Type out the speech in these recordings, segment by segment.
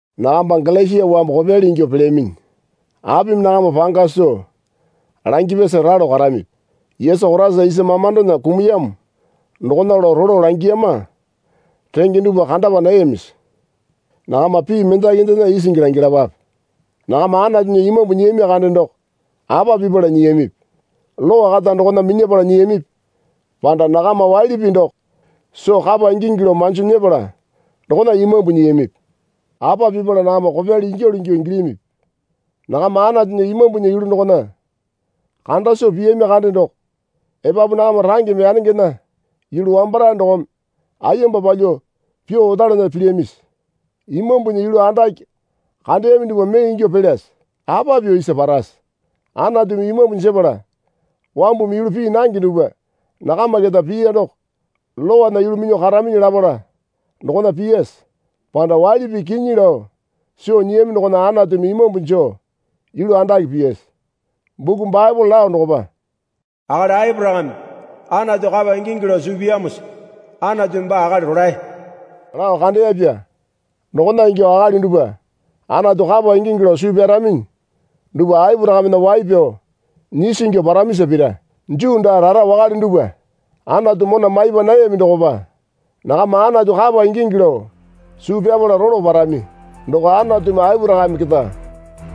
Nakamba Galasia wambu kopyali ingyuo pelyaminyi. Apimi nakama panga soo langipyasa ralo karamipi? Yesu Koraisa isa mamandona kumuyamo dokona lao rolo langiyama renge dupwa kandapa nayamisi? Nakama pii mendakindena isingi langilapape. Nakama Anatunya Imambu nyiyami kande doko apa pipala nyiyamipi? Lowa kata dokona minyapala nyiyamipi panda nakama waili pii doko soo kapa ingingi lao manjo nyepala dokona Imambu nyiyamipi? Apa pipala nakama kopyali ingyalu ingyuo ingilyamipi? Nakama Anatunya Imambunya yulu dokona kanda soo piyami kande doko, epapu nakama rangeme yanengena yulu wambarae dokome ayemba palyuo pyuo otalana pilyamisi? Imambunya yulu andake kandeyami dupwa mee ingyuo pelyase? Apa pyuo isa parase? Anatumi Imambu jepala wambumi yulu pii nange dupwa nakama keta piya doko Lowana yulu minyuo karaminyi lapala dokona piyase? Panda waili pii kinyi lao soo nyiyami dokona Anatumi Imambu joo yulu andake piyase? Buku Baepole lao dokopa, Akali Aporakame Anatu kapa ingingi lao suu piyamosa Anatumi baa akali rolae lao kandeyapya. Dokona ingyuo akali dupwa Anatu kapa ingingi lao suu pyaraminyi dupwa Aporakamena wai pyao nyisi ingyuo paramisa pira. Juu daa rara wakale dupwa Anatu mona maipa nayami dokopa nakama Anatu kapa ingingi lao suu pyapala rolo parami. Doko Anatumi Aporakame keta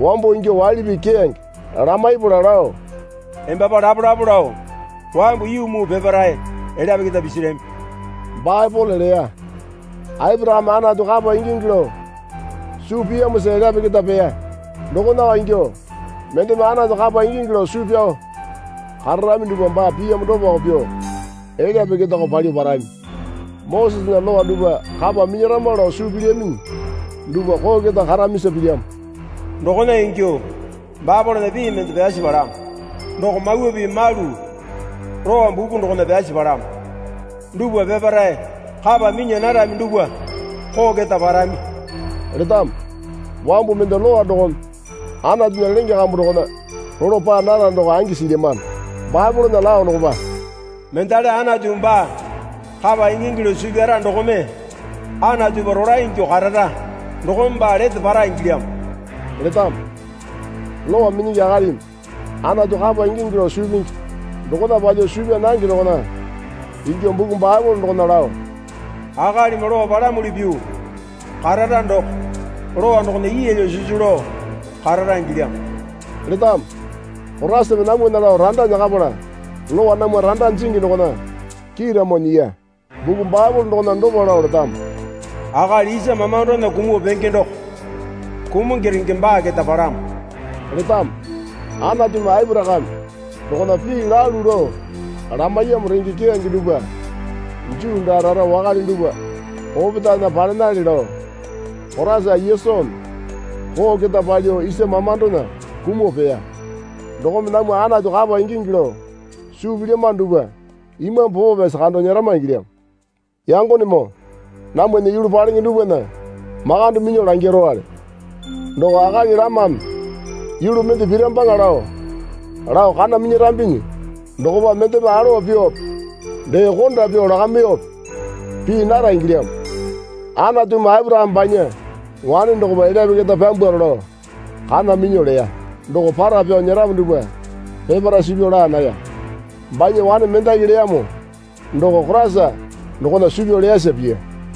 wambo ingyuo waili pii keyange lamaipala lao, Embapa lapolapo lao wambu yuu muu peparae elyape keta pisirami Baepole leya. Aporakame Anatu kapa ingingi lao suu piyamosa elyape keta peya. Dokonako ingyuo mendeme Anatu kapa ingingi lao suu pyao kararami dupwa baa piyamo dopako pyuo elyape ketako palyuo parami. Mosesena Lowa dupwa kapa minyarama lao suu pilyaminyi dupwa koo keta karamisa pilyamo. Dokona ingyuo Baepolena pii mende pyasi palamo. Doko mawa pii malu Lowa buku dokona pyasi palamo dupwa peparae kapa minya narami dupwa koo keta parami letamo. Wambu mende Lowa dokome Anatuya lenge kambu dokona rolo paa nara doko angi silyamano. Baepolena lao dokopa, Mendali Anatu baa kapa ingingi lao suu pyara dokome Anatupa rolae ingyuo karara dokome baa lete para ingilyamo letamo. Lowa minyingi akalimi Anatu kapa ingingi lao suu pingi dokona palyuo suu pyaa nange Dokona ingyuo buku Baepole dokona lao, Akalimi Lowa palamuli pyuo karara doko Lowa dokona yeelyo sisu lao karara ingilyamo letamo. Koraisame namwana lao randa nyakapala Lowa namwa randa jingi dokona kiiramo nyiya. Buku Baepole dokona dopa lao letamo. Akali isa mamandona kumuo penge doko kumungi renge baa keta palamo letamo. Anatumi Aporakame dokona pii lalu lao lamaiyamo renge keyange dupwa Juu daa rara wakale dupwa opetaena palenale lao, Koraisa Yesumi koo keta palyuo isa mamandona kumuo peya. Dokome namwa Anatu kapa ingingi lao suu pilyamano dupwa Imambu Poo Pyasi kando nyerama ingilyamo. Yangonemoo namwana yulu palenge dupwana makande minyuo langirowale. Doko akali lamame yulu mende pirambaŋa lao lao kana minyarambinyi dokopa mendeme alowa pyuope dee konda pyuo lakamyuope pii nara ingilyamo. Anatumi Aporakame banya wane dokopa elyape keta pyambwaro lao kana minyuo leya. Doko para pyao nyeramo dupwa peparae suu pyao laa naya. Banya wane mendaki leyamo doko Koraisa dokona suu pyao leyasa piya.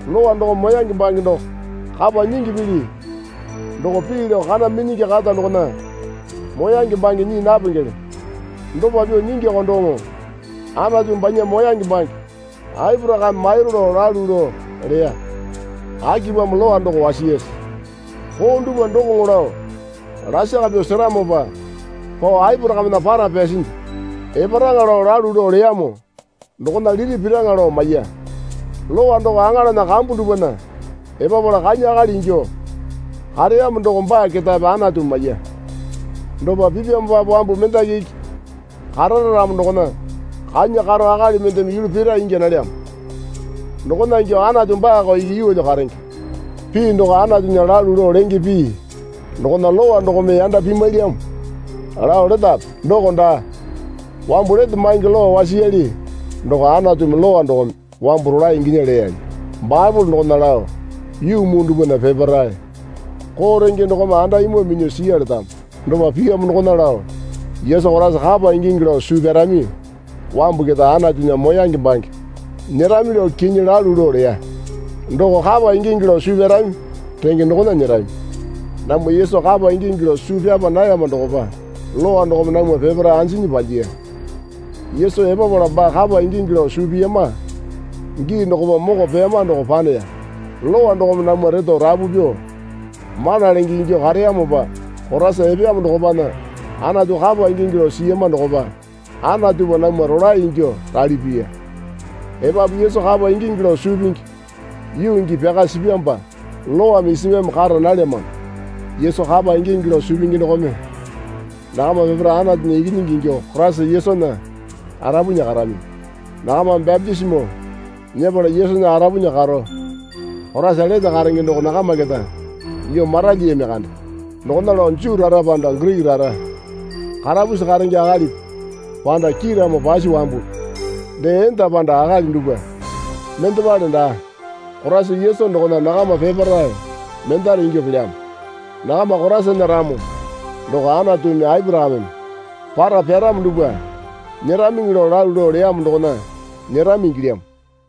Lowa dokome moyange bange doko kapa nyingi pili doko pii lao kana minyingi kata dokona moyange bange nyii napengele. Dopa pyuo nyingiko doŋo Anatumi banya moyange bange Aporakame mairu lao lalu lao leya. Akipamo Lowa doko wasiyase? Koo dupwa dokoŋo lao lasaka pyuo seramopa pao Aporakamena para pyasinde eparaŋa lao lalu lao leyamo dokona liti piraŋa lao maiya. Lowa doko aŋalana kambu dupwana epapala kanya akali ingyuo kareyamo doko baa ketape Anatumi maiya. Dopa pipyamopape wambu mendaki iki karara ramo dokona kanya karo akali mendeme yulu pira ingya nalyamo. Dokona ingyuo Anatu baako iki yeelyo karenge. Pii doko Anatunya lalu lao lenge pii dokona Lowa dokome yanda pimwailyamo lao letape? Doko daa. Wambu lete maingi lowa wasiyali doko Anatumi lowa dokome wambu rolae inginya leyali. Baepole dokona lao yuu muu dupwana peparae koo renge dokome anda imwa minyuo siya letamo. Dopa piyamo dokona lao Yesu Koraisa kapa ingingi lao suu pyarami wambu keta Anatunya moyange bange nyerami lao kinyi lalu lao leya. Doko kapa ingingi lao suu pyarami renge dokona nyerami. Namwa Yesu kapa ingingi lao suu pyapa nayama dokopa Lowa dokome namwa peparae anjinyi palyiya. Yesu epapala baa kapa ingingi lao suu piyama gii dokopa moko peyama doko paneya. Lowa dokome namwa reto rapu pyuo mana lenge ingyuo kareyamopa Koraisa epeyamo dokopana Anatu kapa ingingi lao siyama dokopa Anatupa namwa rolae ingyuo rali piya. Epapu Yesu kapa ingingi lao suu pingi yuu gii pyaka sipyamopa Lowame isapyamo kara nalyamano. Yesu kapa ingingi lao suu pingi dokome nakama peparae Anatunya ikinyingi ingyuo Koraisa Yesunya arapunya karaminyi. Nakamame bapitisimo nyepala Yesunya arapunya karo Koraisa lete karenge doko nakama keta nyuo maralyiyami kande. Dokona lao Juu rara panda Giriki rara, karapusi karenge akalipi panda kiiramo pasi wambupi dee enda panda akali dupwa mendepali daa. Koraisa Yesu dokona nakama peparae mendare ingyuo pelyamo. Nakama Koraisana ramo doko Anatumi Aporakameme para pyaramo dupwa nyeramiŋi lao lalu lao leyamo dokona nyerami ingilyamo.